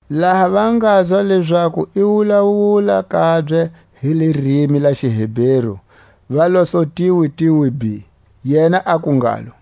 Laha va ngazwa lezaku i wulawula kabye hi lirimi la xiHeberu, va la su tiwitiwi bhi. Yena aku ngalo: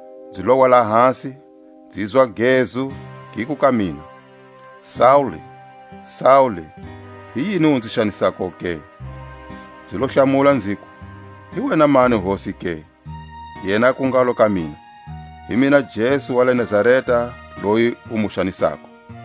Nzi lowa lahasi, nzizwa a gezu, giku ka mina: Saule, Saule, hi yini u nzi xanisako ke? Nzi lo hlamula nziku: Hi wena mani Hosi ke? Yena aku ngalo ka mina: Hi mina Jesu wa le Nazareta loyi u mu xanisako.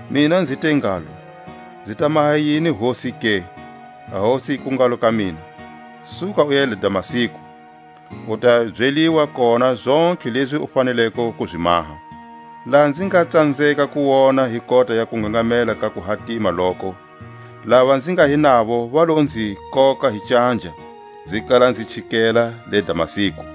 Mina nzi te ngalo: Nzi ta maha yini Hosi ke? A Hosi yiku ngalo ka mina: Suka uya le Damasku, u ta ya byeliwa kona zontlhe lezi u faneleko ku zi maha. Laha nzi nga tsanzeka ku wona hi kota ya kungangamela ka kuhatima loko, lava nzi nga hi navo va lo nzi koka hi canja, nzi kala nzi chikela le Damasku.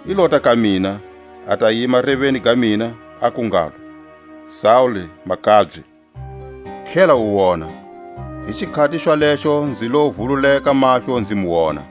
i lota ka mina, a ta yima reveni ga mina, aku ngalo: Saule makabye, tlhela u wona. Hi xikhati xwalexo nzi lo vululeka mahlo nzi mu wona.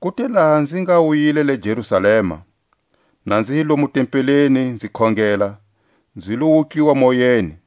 Ku te laha nzi nga wuyile la Jerusalema, na nzi hi lomu tempeleni nzi khongela, nzi lo wutliwa moyeni,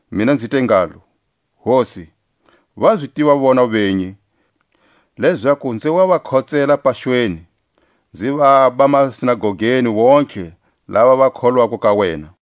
Mina nzi te ngalo: Hosi, va zi tiva vona venyi, lezaku nzi wa va khotsela paxweni, nzi vaba masinagogeni wontihe lava va kholwako ka wena;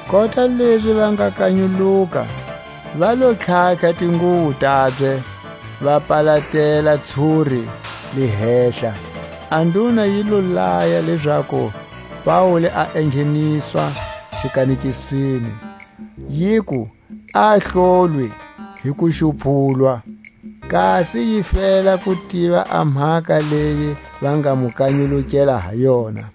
Kota lezi va nga kanyuluka, va lo tlhatlha tinguwo tabye, va palatela ntshuri le hehla. A nduna yi lo laya lezaku Paule a engheniswa xikanekisweni, yiku a hlolwe hi kuxupulwa, kasi yi fela ku tiva a mhaka leyi va nga mu kanyulukela ha yona.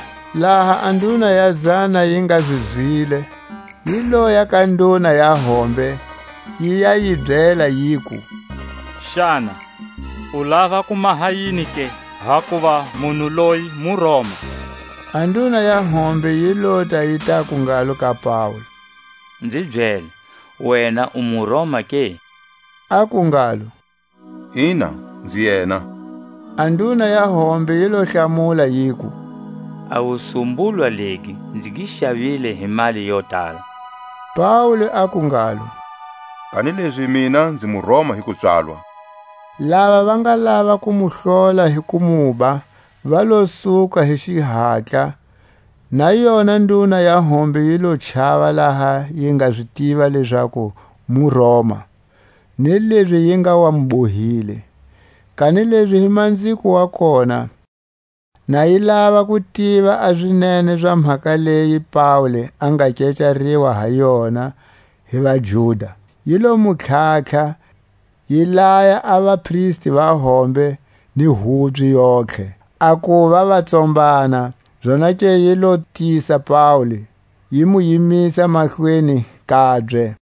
Laha a nduna ya zana yi nga zi zwile, yi loya ka nduna ya hombe, yi ya yi byela yiku: Xana u lava ku maha yini ke? Hakuva munhu loyi muRoma. A nduna ya hombe yi lota yi taku ngalo ka Paule: Nzi byele, wena u muRoma ke? Aku ngalo: Ina, nzi yena. A nduna ya hombe yi lo hlamula, yiku: A wusumbulwa legi nzi gi xavile hi mali yo tala. Paule aku ngalo: Kanilezi mina nzi muRoma hi kupswalwa. Lava va nga lava ku mu hlola hi ku muba va lo suka hi xihatla; na yona nduna ya hombe yi lo chava laha yi nga zi tiva lezaku muRoma, ni lezi yi nga wa mu bohile. Kanilezi hi manziko wa kona, na yi lava ku tiva a zinene za mhaka leyi Paule a nga kecariwa ha yona hi vaJuda, yi lo mu tlhatlha, yi laya a vapristi va hombe ni hubye yontlhe a kuva va tsombana, zonake yi lo tisa Paule, yi mu yimisa mahlweni kabye.